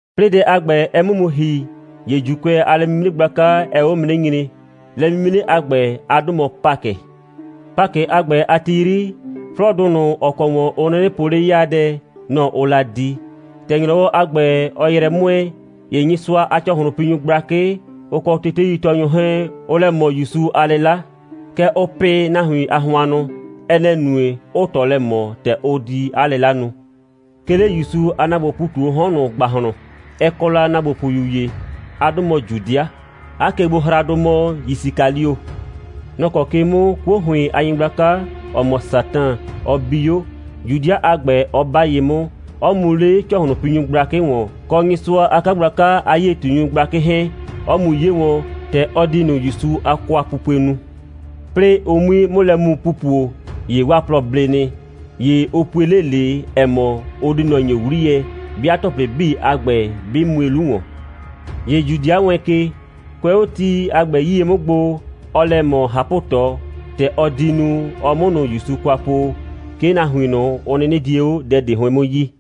'Plɩɩ dɛ a ‑gbɛ, ɛ 'mʋ mu ‑hi, ‑ye ‑Juukʋɛ a lɛ'mimre gblaka, ɛɛ 'o mu 'nɩ nyre. Lɛ'mimre a ‑gbɛ, 'a 'dʋ mɔ Pakɩ. Pakɩ a ‑gbɛ a ti 'yri, 'flɔɔdʋ ꞊nʋ, ‑ɔ kɔ ‑wɔn ʋ 'nɩnɩ po 'le 'yaadɛ, nɔ‑ ʋʋ la di. ‑Tɛ ‑nyrɔwɔdʋ a ‑gbɛ, ɔɔ yrɛ 'mʋɛɛ, ‑ye Nyɩsʋa a ‑cɔhlʋnpinyʋ gblakɩ, ʋ kɔ teteitɔɔnyʋ 'hɛɛn, ʋʋ lɛ ꞊mɔ ‑Yusu a 'lɩla. Kɛɛ, ʋʋ pɩ nahuin a hʋannʋ. Ɛ nɛ‑ nue, 'ʋʋ ꞊tɔ lɛ ꞊mɔ, ‑tɛ ʋ di 'a 'lɩla nu. 'Ke 'le ‑Yusu a ‑naagbopʋʋ ‑pu ꞊tu 'o 'hɔn ꞊nʋ ‑gbahlɔn, ɛ kɔ la ‑naagbopʋyu ‑ye. 'A 'dʋ mɔ Judɩa. 'A kegbohraadʋ mɔ Yisikalio. Nɔ‑ kɔ ke 'mʋ 'kuo ‑hʋɩn a nyɩgblaka, ‑ɔ mɔ Satan, ɔ bi 'o, Judɩa a ‑gbɛ 'ɔ 'ba ye 'mʋ, 'ɔ mu 'le ‑cɔhlʋnpinyʋ gblakɩ ‑wɔn, kɔ Nyɩsʋa a 'kagblaka a 'yie꞊tunyʋ gblakɩ 'hɛɛn, 'ɔ mu 'ye wɔn, ‑tɛ ɔ di ꞊nʋ ‑Yusu a kwapupue nu. 'Plɩɩ ʋ 'mui 'mʋ lɛ mu pupo, ‑ye 'waa plɔ ble nɩ. ‑Ye ʋ pue 'le ꞊le, ‑ɛ mɔ, ʋ di ꞊nɔ ‑nye 'wliyɛ, 'bɩa ‑tɔplɩ 'bii a ‑gbɛ 'bɩ mue 'lu ‑wɔn. ‑Ye Judɩa wɛɛn ke. Kʋɛ 'o ti a ‑gbɛ 'yie 'mʋ gbo, ɔɔ lɛ ꞊mɔ ꞊hapʋ꞊tɔ, ‑tɛ ɔ di nu, ɔ 'mʋ ꞊nʋ ‑Yusu kwa po, 'ke nahuin ꞊nʋ, ʋ 'nɩnɩ die 'o dɛ ꞊de 'hʋɩn 'mʋ yi.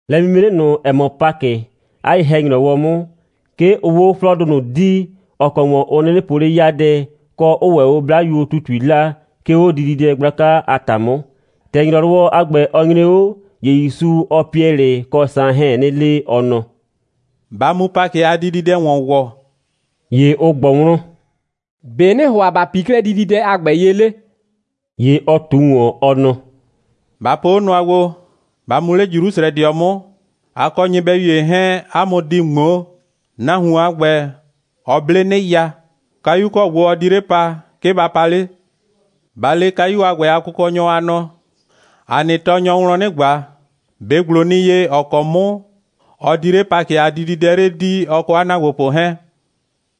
Lɛ'mimre ꞊nʋ, ‑ɛ mɔ Pakɩ, 'a ye‑hɛ‑nyrɔwɔ 'mʋ, 'ke ʋʋ 'o 'flɔɔdʋ ꞊nʋ dii, ‑ɔ kɔ ‑wɔn ʋ 'nɩnɩ po 'le 'yaadɛ, kɔ, 'ʋʋ ‑wɛ 'o 'blayuo ‑tutui 'laa, 'ke 'o dididɛ gblaka a ‑ta 'mʋ. ‑Tɛ ‑nyrɔwɔ a ‑gbɛ, ɔ nyre 'o, ‑ye ‑Yusu, ɔɔ Piɛlɩ kɔ Saan 'hɛɛn 'nɩ le, ɔ nɔ: «Ba mu Pakɩ a dididɛ ‑wɔn ‑wɔ.» ‑Ye ʋ ꞊gbɔ wlɔn: «‑Be' ‑nɩɩ ‑hʋa ‑ba pii 'klɛɛ dididɛ a ‑gbɛ ye 'le?» ‑Ye ɔ ꞊tu ꞊wɔn, ɔ nɔ: «Ba po 'o nʋa gbo: Ba mu 'le Jrusrɛdɩɔ 'mʋ. A kɔ nyɩbɛyu ‑ye 'hɛɛn, 'a mʋ di ꞊ŋmoo. Nahuon a ‑gbɛ, ɔ 'ble 'nɩya. Kayu ‑kɔ gbo ɔ di 'le pa, 'ke ba pa 'le. Ba le kayu a ‑gbɛ a kʋkɔnyɔ, a nɔ: ‑A nɩ tɔɔnyɔɔ wlɔn 'nɩ ꞊gba: ‑Be' ‑gblo nɩ ye, ‑ɔ kɔ 'mʋ ɔ di 'le Pakɩ a dididɛ 'le dii, ɔ kɔ 'a ‑naagbopʋ 'hɛɛn?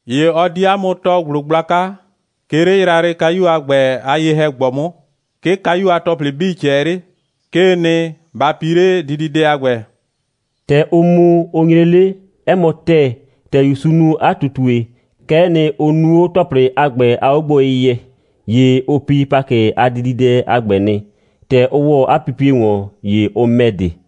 ‑Ye ɔ di 'a mʋ tɔɔ ‑gblo gblaka, 'ke 'le yrayrɩkayu a ‑gbɛ a ye‑hɛ‑gbɔ 'mʋ. 'Ke kayu a ‑tɔplɩ 'bii ꞊cɛɛ 'le. 'Kee nɩ, ba pii 'le dididɛ a ‑gbɛ!» ‑Tɛ ʋ mu, ʋ nyre 'le, 'ɛ mɔ ‑tɛɛ, ‑tɛ ‑Yusu nu 'a ꞊tutue, kɛ'ɛ nɩ, ʋ nu 'o ‑tɔplɩ a ‑gbɛ a 'ogboyɩyɛ. ‑Ye ʋ pi Pakɩ a dididɛ a ‑gbɛ nɩ. ‑Tɛ ʋ ‑wɔ 'a pipie ‑wɔn, ‑ye ʋ ‑mɛ de.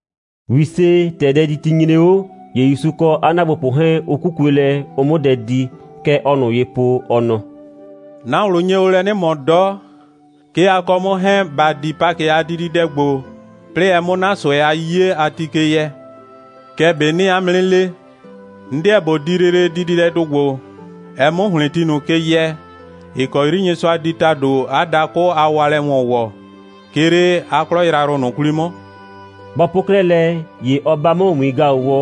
‑Wise, ‑tɛ dɛditi nyre 'o, ‑ye ‑Yusu kɔ 'a ‑naagbopʋ 'hɛɛn, ʋ 'kukue lɛ, ʋ 'mʋ dɛ di. Kɛ ɔɔ ꞊nʋ ye po, ɔ nɔ: «'Na ꞊wlʋ nye o lɛ 'nɩ ꞊mɔ 'dɔ, 'ke a kɔ 'mʋ 'hɛɛn ‑ba di Pakɩ a dididɛ ‑gbo, 'plɩɩ ɛ 'mʋ 'na ꞊sʋɛ a 'yiye a ti ke yɛ. Kɛɛ ꞊be 'nɩɩ 'a mʋ 'nɩ le: 'N 'deɛ ꞊bo di lele dididɛdʋ ‑gbo, ɛ 'mʋ ‑hlɩn ti ꞊nʋ ke yɛ, ‑ɩ kɔ 'yri Nyɩsʋa di ‑tado 'a dakʋ a waalɛ ‑wɔn ‑wɔ, 'ke 'le 'a 'klɔ yrayrʋ ꞊nʋ 'kwli 'mʋ.» Bɔ po 'klɛɛ lɛ, ‑ye ɔ 'ba 'mʋ ‑wiin‑gaʋwɔ,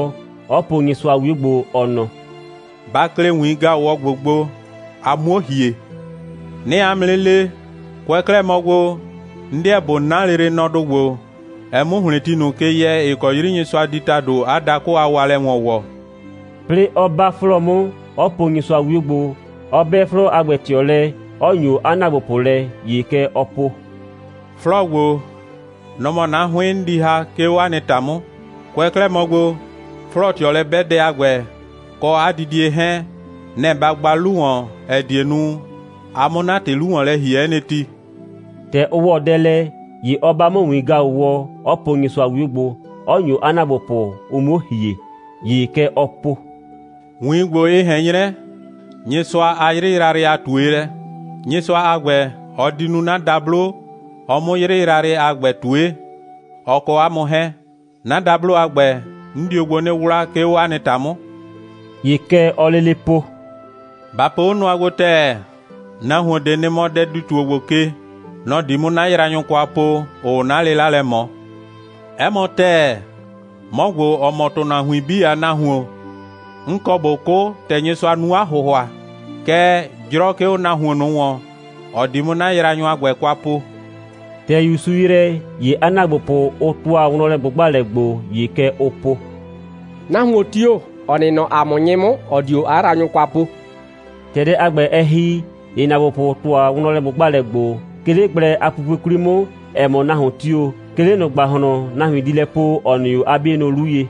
'ɔ po Nyɩsʋa a 'wio gbo, ɔ nɔ: «Ba klɩ ‑wiin‑gaʋwɔ ‑gbo gbo, a 'muo ‑hie. 'Nɩɩ 'a mʋ 'nɩ le: Kʋɛ 'klɛɛ mɔ gbo, 'n 'deɛ ꞊bo 'na lele nɔdʋ ‑gbo, ɛ 'mʋ ‑hlɩn ti ꞊nʋ ke yɛ, ‑ɩ kɔ 'yri Nyɩsʋa di ‑tado 'a dakʋ a waalɛ ‑wɔn ‑wɔ,» 'plɩɩ, 'ɔ 'ba 'flɔɔ 'mʋ, 'ɔ po Nyɩsʋa a 'wio gbo, 'ɔ 'bɛ 'flɔɔ a ‑gbɛ ꞊tɩɔ lɛ, 'ɔ ‑nyo 'a ‑naagbopʋ lɛ. ‑Ye kɛ ɔɔ po: «'Flɔɔ ‑gbo, nɔ‑ mɔ 'na 'hʋɩn, 'n di ‑ha, 'ke 'o 'a nɩ ‑ta 'mʋ. Kʋɛ 'klɛɛ mɔ gbo, 'flɔɔ꞊tɩɔlɛ'bɛdɛ a ‑gbɛ, kɔ 'a didie 'hɛɛn, nɛ‑ ba gba 'lu ‑wɔn, ‑ɛ die nu, a 'mʋ 'na ‑tɩ 'lu ‑wɔn lɛ ‑hie 'ɛ nɩ ti.» ‑Tɛ ʋ ‑wɔ dɛ lɛ, ‑ye ɔ 'ba 'mʋ ‑wiin‑gaʋwɔ, 'ɔ po Nyɩsʋa a 'wio gbo, 'ɔ ‑nyo 'a ‑naagbopʋ, ʋ 'muo ‑hie. ‑Ye kɛ ɔɔ po: «‑Wiin ‑gbo, ɩ ꞊hɛn 'nyrɛ Nyɩsʋa a 'yrɩ yrayrɩ a ꞊tuelɛ. Nyɩsʋa a ‑gbɛ, ɔ di nu 'na dablo, ɔ 'mʋ 'yrɩ yrayrɩ a ‑gbɛ ꞊tue, ɔ kɔ 'a mʋ 'hɛɛn. 'Na dablo a ‑gbɛ, 'n dio gbo 'nɩ 'wla, 'ke 'o 'a nɩ ‑ta 'mʋ.» ‑Ye kɛ ɔɔ lele po: «Ba po 'o nʋa gbo ‑tɛɛ: Nahuon ꞊de nɩ mɔ dɛdi‑tuo ‑gbo ke. Nɔ‑ di 'mʋ 'na yraanyʋ kwa po, ‑ʋʋ 'na 'lɩla lɛ ꞊mɔ. 'Ɛ mɔ ‑tɛɛ, 'mɔ ‑gbo, ‑ɔ mɔ ‑tʋnahuin 'bii a Nahuon, 'n kɔ ꞊bo 'kʋ, ‑tɛ Nyɩsʋa nu 'a ‑hʋhʋa. Kɛɛ, 'jrɔ 'ke 'o nahuon ꞊nʋ ‑wɔn, ‑ɔ di 'mʋ 'na yraanyʋ a ‑gbɛ kwa po.» ‑Tɛ ‑Yusu ‑yrɛ, ‑ye 'a ‑naagbopʋ, ʋ ‑tʋa wlɔnlɛ꞊gbʋgbalɛ gbo, ‑ye kɛ ʋʋ po: «Nahuon tio‑, ‑ɔ nɩ nɔ ‑a mʋ 'nyɩ 'mʋ, ‑ɔ dio 'a yraanyʋ kwa po.» ‑Tɛ dɛ a ‑gbɛ, ɛ ‑hi, ‑ye ‑naagbopʋ ‑tʋa wlɔnlɛ꞊gbʋgbalɛ gbo, 'ke 'le gblɛ a pupue 'kwli 'mʋ, ‑ɛ mɔ, nahuon tio‑, 'ke 'le ꞊nʋ ‑gbahlɔn, nahuin di lɛ po, nɔ‑ nɩ 'o 'a 'bienʋ 'lu ye.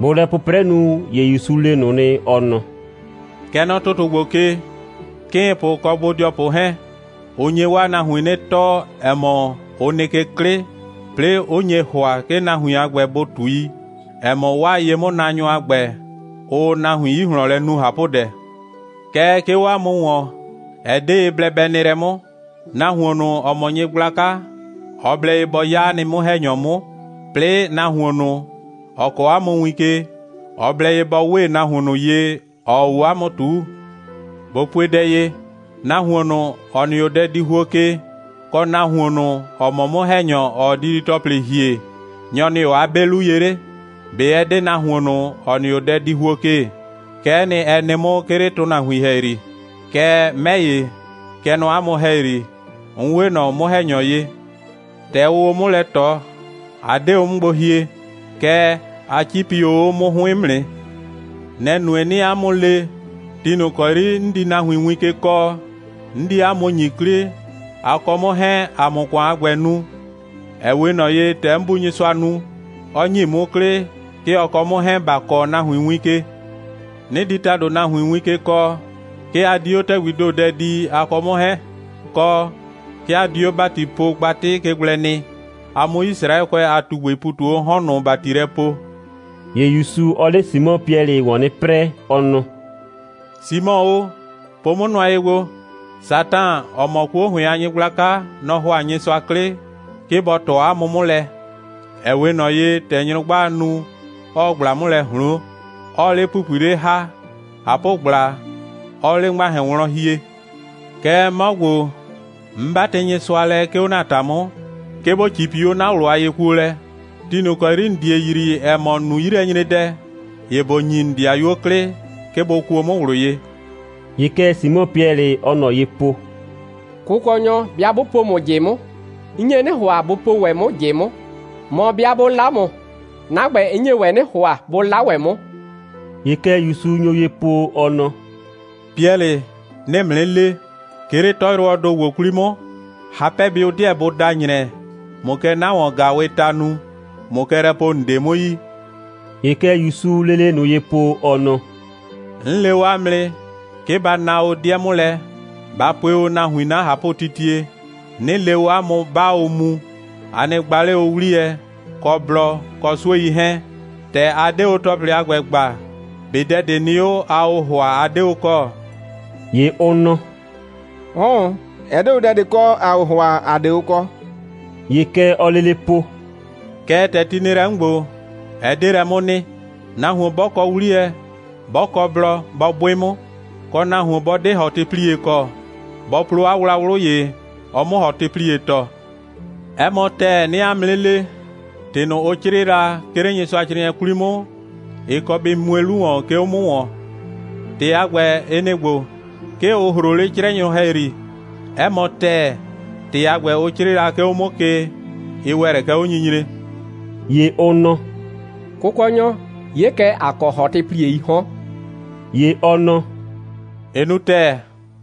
Bʋʋ lɛ 'pʋprɛ nu, ‑ye ‑Yusu le ꞊nʋ nɩ, ɔ nɔ: «Kɛ nɔ ‑tʋtʋ ‑gbo ke, 'kɩɩnpʋ kɔ bodɩɔpʋ 'hɛɛn, ʋ nye 'waa nahuin 'nɩ tɔɔ, ‑ɛ mɔ, ʋ nɩ ke 'klɩ, 'plɩɩ, 'ʋ nye ‑hʋa, 'ke nahuin a ‑gbɛ, bʋ ꞊tui, ‑ɛ mɔ 'waa ye'mʋnaanyʋ a ‑gbɛ, ʋʋ nahuin 'yi ꞊hlɔn lɛ nu ꞊hapʋdɛ. Kɛɛ, 'ke 'o 'a mʋ ‑wɔn, ɛ 'de ye blɛ bɛ nɩ lɛ 'mʋ. Nahuon ꞊nʋ, ‑ɔ mɔ nyɩgblaka, ɔ blɛ ye bɔ 'ya 'a nɩ 'mʋ‑hɛnyɔ 'mʋ, 'plɩɩ, nahuon ꞊nʋ, ‑ɔ kɔ 'a mʋ win ke, ɔ blɛ ye bɔ 'we ꞊nɔ nahuon ꞊nʋ ye, ‑ɔɔ 'o 'a 'mʋ ꞊tuu. ꞊Bo pue dɛ ye: Nahuon ꞊nʋ, ‑ɔ nɩ 'o dɛdihuo ke, kɔ nahuon ꞊nʋ, ‑ɔ mɔ 'mʋ‑hɛnyɔ, ‑ɔɔ didi‑tɔplɩ ‑hie, nyɔ‑ nɩ 'o 'a 'be 'lu ye 'le? ꞊Be ɛ 'de nahuon ꞊nʋ, ‑ɔ nɩ 'o dɛdihuo ke? Kɛ'ɛ nɩ, ɛ nɩ 'mʋ, 'ke 'le ‑tʋnahuin ‑hɛyri. Kɛɛ, 'mɛ ‑ye, kɛ nɔ 'a mʋ ‑hɛyri, 'n 'we ꞊nɔ 'mʋ‑hɛnyɔ ye. ‑Tɛ ʋʋ o 'mʋ lɛ ꞊tɔ, a 'de o 'mʋ gbo hie, kɛɛ, a 'cipi o 'o 'mʋ 'hʋɩn 'mʋ nɩ. Nɛ‑ nue, 'nɩɩ 'a mʋ le, ti ꞊nʋ ‑kɔ 'yri 'n di nahuin win ke kɔɔ, 'n di 'a mʋ ‑nyi 'klɩ, a kɔ 'mʋ 'hɛɛn, ‑a 'mʋ ‑kʋan a ‑gbɛ nu, ‑ɛ 'we ꞊nɔ ye, ‑tɛ 'n Bu Nyɩsʋa nu, 'ɔ ‑nyi 'mʋ 'klɩ, 'ke ɔ kɔ 'mʋ 'hɛɛn, ‑ba kɔɔ nahuin win ke. 'Nɩ di ‑tado nahuin win ke kɔɔ, 'ke a di 'o ‑tɛgbii ‑do dɛ dii, a kɔ 'mʋ 'hɛɛn, kɔ, 'ke a di 'o ‑batipogbatɩ ke gblɛ nɩ, a 'mʋ Yisraɛkʋɛ a ꞊tugbɩɩ ‑pu ꞊tu 'o 'hɔn ꞊nʋ ‑bati lɛ poo.» ‑Ye ‑Yusu, ɔɔ 'le Simɔ Piɛlɩ ‑wɔn 'nɩ 'prɛɛ, ɔ nɔ: «Simɔ o, po 'mʋ nʋa ye gbo. Satan, ‑ɔ mɔ 'kuo ‑hʋɩn a nyɩgblaka, nɔ‑ ‑hʋa Nyɩsʋa 'klɩ, 'ke bɔ ꞊tɔ 'a mʋ 'mʋ lɛ, ‑ɛ 'we ꞊nɔ ye, ‑tɛ nyrʋgbaa nu, 'ɔɔ ꞊gbla 'mʋ lɛ ꞊hloon, 'ɔɔ 'le ‑pupui 'le ‑ha, ꞊hapʋgbla 'ɔɔ 'le ‑ŋmahɛn wlɔn hie. Kɛɛ, 'mɔ ‑gbo, 'n 'batɩ Nyɩsʋa lɛ, 'ke 'o ‑na ‑ta 'mʋ, 'ke ‑bo 'cipi 'o 'na ꞊wlʋ a yekuolɛ. Ti ꞊nʋ ‑kɔ 'yri ‑n die yrii, ‑ɛ mɔ, ‑n nu 'yilɛnyredɛ, ‑ye ‑bo ‑nyi ‑n ‑dɩayuo 'klɩ, 'ke bʋ kuo 'mʋ ꞊wlʋ ye.» ‑Ye kɛ Simɔ Piɛlɩ, ɔɔ ꞊nɔ ye po: «Kʋkɔnyɔ, 'bɩa 'bʋ po ‑mʋ ꞊jɩ 'mʋ, 'n nye 'nɩ ‑hʋa, bʋ po ‑wɛ 'mʋ ꞊jɩ 'mʋ. Mɔ, 'bɩa 'bʋ 'la ‑mʋ, 'na ‑gbɛ, 'n nye ‑wɛ 'nɩ ‑hʋa, bʋ 'la ‑wɛ 'mʋ.» ‑Ye kɛ ‑Yusu nyo ye po, ɔ nɔ: «Piɛlɩ, 'nɩɩ ‑mʋ 'nɩ le: 'Ke 'le 'tɔyrʋwɔɔ ‑do ‑gbo 'kwli 'mʋ, hapɛbɩʋ 'deɛ bʋ da ‑nyrɛ, ꞊mʋ kɛ 'na ‑wɔn‑gaawɩɩ ta nu, ꞊mʋ kɛ lɛ po, ‑n 'de 'mʋ yi.» ‑Ye kɛ ‑Yusuu lele ꞊nʋ ye po, ɔ nɔ: «'N le o 'a mʋ nɩ, 'ke ba na o 'dɩɛ 'mʋ lɛ, ba pue o nahuin 'na ꞊hapʋtitie, 'nɩ le o 'a mʋ, 'baa o mu, a nɩ gba 'le o 'wliyɛ, kɔ blɔ, kɔ 'suei 'hɛɛn. ‑Tɛ a 'de o ‑tɔplɩ a ‑gbɛ gba, ꞊be dɛ ꞊de nɩ 'o, aa o ‑hʋa, a 'de o kɔ?» ‑Ye ʋ nɔ: «'Ʋʋn, ɛ 'de o dɛ ꞊de kɔ, ‑aa o ‑hʋa, ‑a 'de o kɔ.» ‑Ye kɛ ɔɔ lele po: «Kɛɛ, ‑tɛ ti nɩ lɛ 'mʋ ‑gbo, ɛ 'de lɛ 'mʋ nɩ. Nahuon 'bɔ kɔ 'wliyɛ, 'bɔ kɔ blɔ, bɔ 'bʋɩ 'mʋ. Kɔ, nahuon 'bɔ 'de ‑hɔtɩplie kɔ, bɔ plo 'a wlawlʋ ‑ye, ɔ 'mʋ ‑hɔtɩplie ‑tɔ. 'Ɛ mɔ ‑tɛɛ, 'nɩɩ 'a mʋ 'nɩ le, ‑tɩ ꞊nʋ, ʋ 'crɩɩ la, 'ke 'le Nyɩsʋacrɩɩnɩɛ 'kwli 'mʋ, ɩ kɔ bɩ mue 'lu ‑wɔn, 'ke 'o 'mʋ ‑wɔn. ‑Tɩ a ‑gbɛ, ɩ nɩ‑ ‑gbo: 'Ke ʋ ‑hroo 'le 'crɛnyʋ ‑hɛyri. 'Ɛ mɔ ‑tɛɛ, ‑tɩ a ‑gbɛ, ʋ 'crɩɩ la, 'ke 'o 'mʋ ke, ɩ ‑wɛ lɛ kɛ 'onyinyre.» ‑Ye ʋ nɔ: «Kʋkɔnyɔ, 'ye kɛ, ‑a kɔ ‑hɔtɩplieii 'hɔn.» ‑Ye ɔ nɔ: «Ɩ nu ‑tɛɛ.»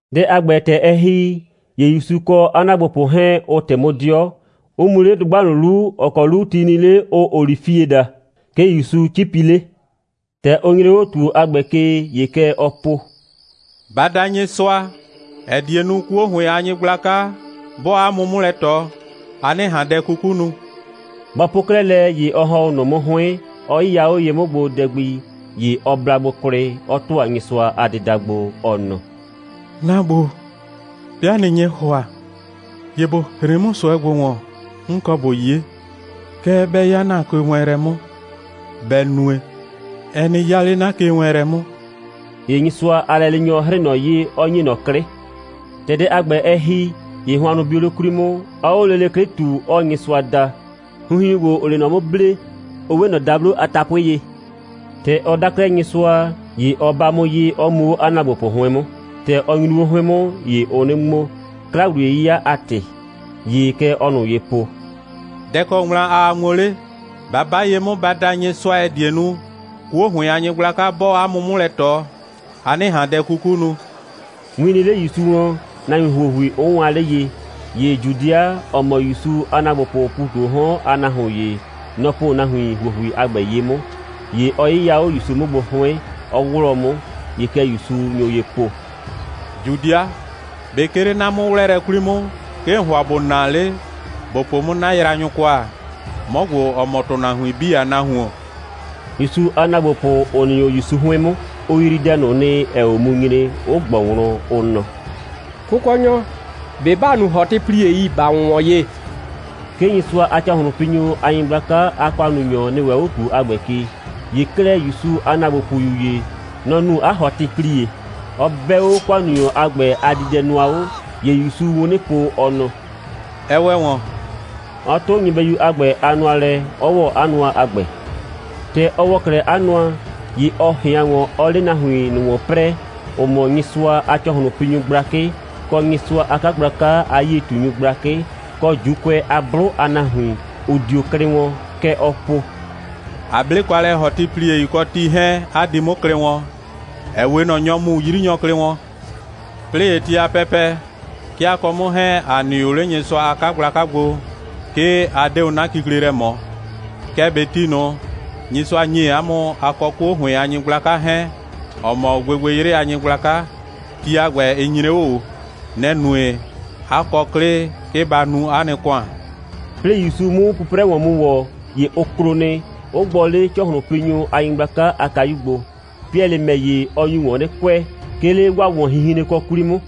Dɛ a ‑gbɛ, ‑tɛ ɛ ‑hi, ‑ye ‑Yusu kɔ 'a ‑naagbopʋ 'hɛɛn, ʋ ꞊tɩ 'mʋ 'dɩɔ, 'ʋ mu 'le dʋgba ꞊nʋ 'lu, ‑ɔ kɔ 'lu ti nɩ 'le, ʋʋ olifie daa. 'Ke ‑Yusu 'cipi 'le. ‑Tɛ ʋ nyre 'o ‑tuo a ‑gbɛ ke, ‑ye kɛ ɔɔ po: «Ba da Nyɩsʋa, ‑ɛ die nu, 'kuo ‑hʋɩn a nyɩgblaka, 'bɔɔ 'a mʋ 'mʋ lɛ ꞊tɔ, a 'nɩ ꞊han dɛ 'kuku nu.» Bɔ po 'klɛɛ lɛ, ‑ye ɔ ‑hɔn 'o ꞊nʋ 'mʋ 'hʋɩn, 'ɔ 'yɩya 'o ye 'mʋ gbo dɛ gbi. ‑Ye ɔ bla gbo kwlɩ, 'ɔ ‑tʋa Nyɩsʋa a dɩda gbo, ɔ nɔ: «'Na Bu, 'bɩa ꞊nɩ nye ‑hʋa, ‑ye ‑bo hren 'mʋ ꞊sʋɛ ‑gbo ‑wɔn, 'n kɔ ꞊bo 'ye. Kɛɛ, bɛ 'ya ‑na kewɛɛnlɛ 'mʋ, bɛ nue, ɛ nɩ 'ya 'le 'na kewɛɛnlɛ 'mʋ.» [ ‑Ye Nyɩsʋa a lɛleenyɔ 'hrɩɩ ꞊nɔ ye, 'ɔ ‑nye ꞊nɔ 'klɩ. ‑Tɛ dɛ a ‑gbɛ, ɛ ‑hi, ‑ye hʋannʋ bio 'le 'kwli 'mʋ, 'ɔɔ 'o lele 'klɩ ꞊tu, 'ɔɔ Nyɩsʋa da. Hinhiun ‑gbo, ‑ʋʋ 'le ꞊nɔ 'mʋ ble, ʋ 'we ꞊nɔ dablo a tapʋɩ ye.] ‑Tɛ ɔ da 'klɛɛ Nyɩsʋa, ‑ye ɔ 'ba 'mʋ ye, 'ɔ mu 'o 'a ‑naagbopʋ 'hʋɩn 'mʋ. ‑Tɛ ɔ nyru 'o 'hʋɩn 'mʋ, ‑ye ʋʋ 'nɩ ŋmo, 'kla‑wliye'yɩya a ‑tɩ. ‑Ye kɛ ɔɔ ꞊nʋ ye po: «Dɛ‑ kɔ ŋmla aa ŋmo 'le? Ba 'ba ye 'mʋ, ba da Nyɩsʋa, ‑ɛ die nu, 'kuo ‑hʋɩn a nyɩgblaka 'bɔɔ 'a mʋ 'mʋ lɛ ꞊tɔ, a 'nɩ ꞊han dɛ 'kuku nu.» Win nɩ 'le ‑Yusu wlɔn, nahuin ‑huohui 'ʋ waan 'le ye. ‑Ye Judɩa, ‑ɔ mɔ ‑Yusu a ‑naagbopʋʋ ‑pu ꞊tu 'o 'hɔn a nahuon ‑ye, nɔ‑ po nahuin ‑huohui a ‑gbɛ ye 'mʋ. ‑Ye ɔ 'yɩya 'o ‑Yusu 'mʋ gbo 'hʋɩn, 'ɔ 'wlɔɔ 'mʋ. ‑Ye kɛ ‑Yusu nyo ye po: «Judɩa, ꞊be 'ke 'le 'na 'mʋ'wlɛɛlɛ 'kwli 'mʋ, 'ke ‑n ‑hʋa ‑bo naa 'le, ‑bo po 'mʋ 'na yraanyʋ kwa, 'mɔ ‑gbo, ‑ɔ mɔ ‑tʋnahuin 'bii a Nahuon?» ‑Yusu a ‑naagbopʋ, ‑ʋ nɩ 'o ‑Yusu 'hʋɩn 'mʋ, ʋ yrii dɛ ꞊nʋ nɩ, ‑ɛɛ 'o mu nyre, 'ʋ ꞊gbɔ wlɔn, ʋ nɔ: «Kʋkɔnyɔ, ꞊be ‑ba nu ‑hɔtɩpliei, ‑ba ‑wʋnwɔn ye?» 'Ke Nyɩsʋa a ‑cɔhlʋnpinyʋ a nyɩgblaka a ‑kʋannunyɔ nɩ ‑wɛ 'o ‑tuo a ‑gbɛ ke. ‑Ye 'klɛɛ, ‑Yusu a ‑naagbopʋyu ‑ye, nɔ‑ nu 'a ‑hɔtɩplie, 'ɔ 'bɛ 'o ‑kʋannunyɔ a ‑gbɛ a diidɛnʋa 'o. ‑Ye ‑Yusuu wun 'nɩ po, ɔ nɔ: «Ɛ ‑wɛ ‑wɔn,» 'ɔ 'tʋ nyɩbɛyu a ‑gbɛ a nʋa lɛ, 'ɔ ‑wɔ 'a nʋa a ‑gbɛ. ‑Tɛ ɔ ‑wɔ 'klɛɛ 'a nʋa, ‑ye ɔ ꞊hɩan ‑wɔn, 'ɔɔ 'le nahuin ꞊nʋ ‑wɔn 'prɛɛ, ‑ʋ mɔ Nyɩsʋa a ‑cɔhlʋnpinyʋ gblakɩ, kɔ Nyɩsʋa a 'kagblaka a 'yie꞊tunyʋ gblakɩ, kɔ ‑Juukʋɛ a 'blʋ a nahuin, ‑ʋ dio klɩ wɔn. Kɛ ɔɔ po: «A 'ble kwa lɛ ‑hɔtɩpliei kɔ ti 'hɛɛn, 'a di 'mʋ klɩ wɔn, ‑ɛ 'we ꞊nɔ nyɔ mu 'yrinyɔ klɩ wɔn. 'Plɩɩ ‑ye ti a pɛpɛ, 'ke a kɔ 'mʋ 'hɛɛn, ‑a nɩ o 'le Nyɩsʋa a 'kagblaka gbo, 'ke a 'de o 'na kikle lɛ ꞊mɔ. Kɛɛ ꞊be ti ꞊nʋ, Nyɩsʋa ‑nye 'a mʋ, a kɔ 'kuo ‑hʋɩn a nyɩgblaka 'hɛɛn, ‑ɔ mɔ gbɩgbɩyrɩ a nyɩgblaka, ti a ‑gbɛ, nɩ‑ nyre 'o. Nɛ‑ nue, 'a kɔ 'klɩ, 'ke ba nu 'a nɩ ‑kʋan.» 'Plɩɩ ‑Yusu 'mʋ 'pʋprɛ ‑wɔn mu ‑wɔ, ‑ye ʋ klo nɩ, 'ʋ gbɔ 'le ‑cɔhlʋnpinyʋ a nyɩgblaka a kayu gbo. Piɛlɩ ‑mɛ ‑ye, ɔ nyu ‑wɔn 'nɩ kʋɛ, 'ke 'le 'waa ‑wɔnhinhrenkɔ 'kwli 'mʋ.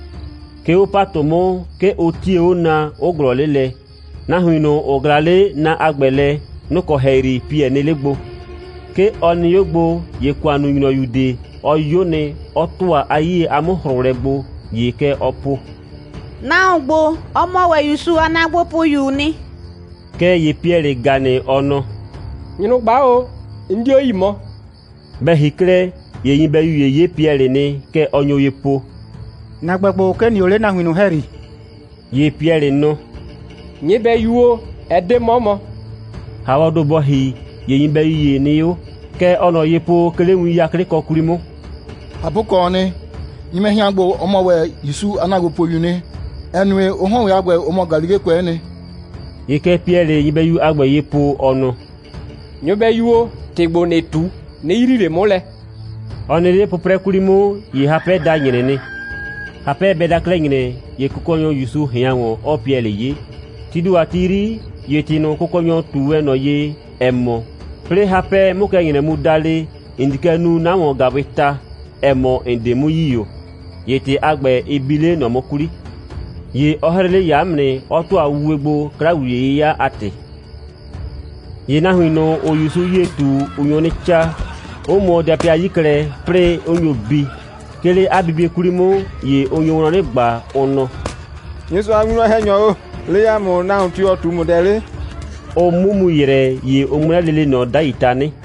'Ke 'o ‑patʋ 'mʋ, 'ke ʋ 'tie 'o na, 'ʋ ꞊glɔɔ 'le lɛ. Nahuin ꞊nʋ, ‑ʋ ꞊glaa 'le na a ‑gbɛ lɛ, nʋ‑ kɔ ‑hɛyri Piɛlɩ nɩ 'le gbo. 'Ke ɔ nɩ 'o ‑gbo, ‑ye ‑kʋannunyrɔyu ꞊de, ɔ 'yo nɩ, 'ɔ ‑tʋa 'a 'yie a 'mʋ‑hrʋʋlɛ gbo, ‑ye kɛ ɔɔ po: «Nahuon ‑gbo, ɔ mɔ ‑wɛ ‑Yusu a ‑naagbopʋyuu nɩ.» Kɛɛ ‑ye Piɛlɩ ‑ga nɩ, ɔ nɔ: «Nyrʋgba o, 'n 'dio yi mɔ.» Bɛ ‑hi 'klɛɛ, ‑ye nyɩbɛyu ‑ye 'ye Piɛlɩ nɩ. Kɛ ɔ nyo ye po: «‑Na ‑gbɛ ‑gbo, 'ke ‑n nɩ o 'le 'a nahuin ꞊nʋ ‑hɛyri.» ‑Ye Piɛlɩ nɔ: «Nyɩbɛyu o, ɛ 'de 'mɔ mɔ.» ‑Haawɔɔ ‑do bɔ ‑hi, ‑ye nyɩbɛyu ‑ye nɩ 'o. Kɛ ɔɔ ꞊nɔ ye po, 'ke 'le win 'yaklɩkɔ 'kwli 'mʋ: «꞊Hapʋkɔɔ nɩ, nyɩbɛhɩan ‑gbo, ɔ mɔ ‑wɛ ‑Yusu a ‑naagbopʋyuu nɩ, ‑ɛ nue, ʋ 'hɔn ‑wɛ a ‑gbɛ, ʋ mɔ Galilekʋɛ'ɛ nɩ.» ‑Ye kɛ Piɛlɩɩ nyɩbɛyu a ‑gbɛ ye po, ɔ nɔ: «Nyɩbɛyu o, ‑tɩ ‑gbo ‑nɩɩ ꞊tu, 'nɩ yrii ꞊le 'mʋ lɛ.» Ɔ nɩ 'le 'pʋprɛ 'kwli 'mʋ, ‑ye hapɛ da ‑nyrɛ nɩ. Hapɛ bɛ da 'klɛɛ ‑nyrɛ, ‑ye Kʋkɔnyɔ ‑Yusu ꞊hɩan ‑wɔn, 'ɔɔ Piɛlɩ 'ye. Tii ‑do a ti 'yri, ‑ye ‑tɩ ꞊nʋ, Kʋkɔnyɔ ꞊tu wɛn ꞊nɔ ye, ‑ɛ mɔ: «'Plɩɩ hapɛ 'mʋ kɛ ‑nyrɛ mu da le, ‑n di kɛ nu 'na ‑wɔn‑gaawɩɩ ta, ‑ɛ mɔ, ‑n 'de 'mʋ yi ‑o,» ‑ye ‑tɩ a ‑gbɛ, ɩ bi 'le ꞊nɔ 'mʋ 'kwli. ‑Ye ɔ 'hrɩ 'le ‑yaa 'mʋ nɩ, 'ɔ ‑tʋa wuwe gbo, 'kla‑wliye'yɩya a ‑tɩ. ‑Ye nahuin ꞊nʋ, ‑ʋʋ ‑Yusu 'yie ꞊tu, ʋ nyo 'nɩ 'caa, 'ʋ mʋɔ dapɩa 'yi klɛ, 'plɩɩ 'ʋ nyo bi. 'Ke 'le 'a bibie 'kwli 'mʋ, ‑ye ʋ nyo wlɔn 'nɩ ꞊gba, ʋ nɔ: «Nyɩsʋa a winwlɔn‑hɛnyɔ o, le ‑a mʋ, nahuon tio‑ ꞊tu ‑mʋ dɛ 'le?» Ʋ 'mʋ mu ‑yrɛ, ‑ye ʋ 'ŋmlɛ lele ꞊nɔ 'dai tanɩ.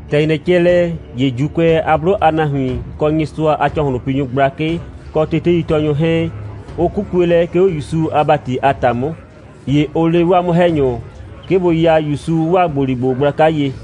‑Tɛ ‑nyrɛ cɛ lɛ, ‑ye ‑Juukʋɛ a 'blʋ a nahuin, kɔ Nyɩsʋa a ‑cɔhlʋnpinyʋ gblakɩ, kɔ teteitɔɔnyʋ 'hɛɛn, ʋ 'kukue lɛ, 'ke 'o ‑Yusu a ‑bati a ‑ta 'mʋ. ‑Ye ʋ le 'waa 'mʋ‑hɛnyʋ, 'ke bʋ ya ‑Yusu 'waa ‑gboligbo gblaka ye.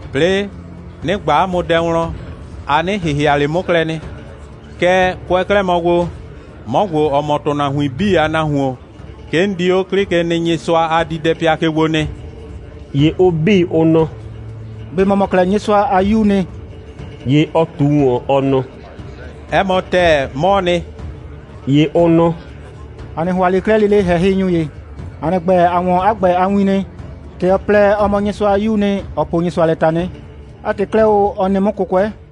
'Plɩɩ, 'nɩ ꞊gba 'a mʋ dɛ wlɔn, a 'nɩ ‑hɩhɩa ꞊le 'mʋ klɛ nɩ. Kɛɛ, kʋɛ 'klɛɛ mɔ gbo, 'mɔ ‑gbo, ‑ɔ mɔ ‑tʋnahuin 'bii a Nahuon, 'ke 'n di 'o 'Klɩkenɩnyɩsʋa a diidɛpɩa ke gbo nɩ.» ‑Ye ʋ 'bii, ʋ nɔ: «꞊Be ‑mɔ mɔ 'klɛɛ Nyɩsʋa a 'Yuu nɩ?» ‑Ye ɔ ꞊tu ‑wɔn, ɔ nɔ: «'Ɛ mɔ ‑tɛɛ, 'mɔɔ nɩ.» ‑Ye ʋ nɔ: «‑A 'nɩ ‑hʋa ꞊le 'klɛɛ lele ‑hɛhɩnyʋ ‑ye. ‑A nɩ ‑gbɛ, ‑a 'wɔn 'a ‑gbɛ a win nɩ. ‑Tɛ ɔ plɛ, ɔ mɔ Nyɩsʋa a 'Yuu nɩ, ɔ poo Nyɩsʋa lɛ tanɩ. 'A ‑tɩ 'klɛɛ o, ɔ nɩ 'mʋ 'kʋkʋɛ.»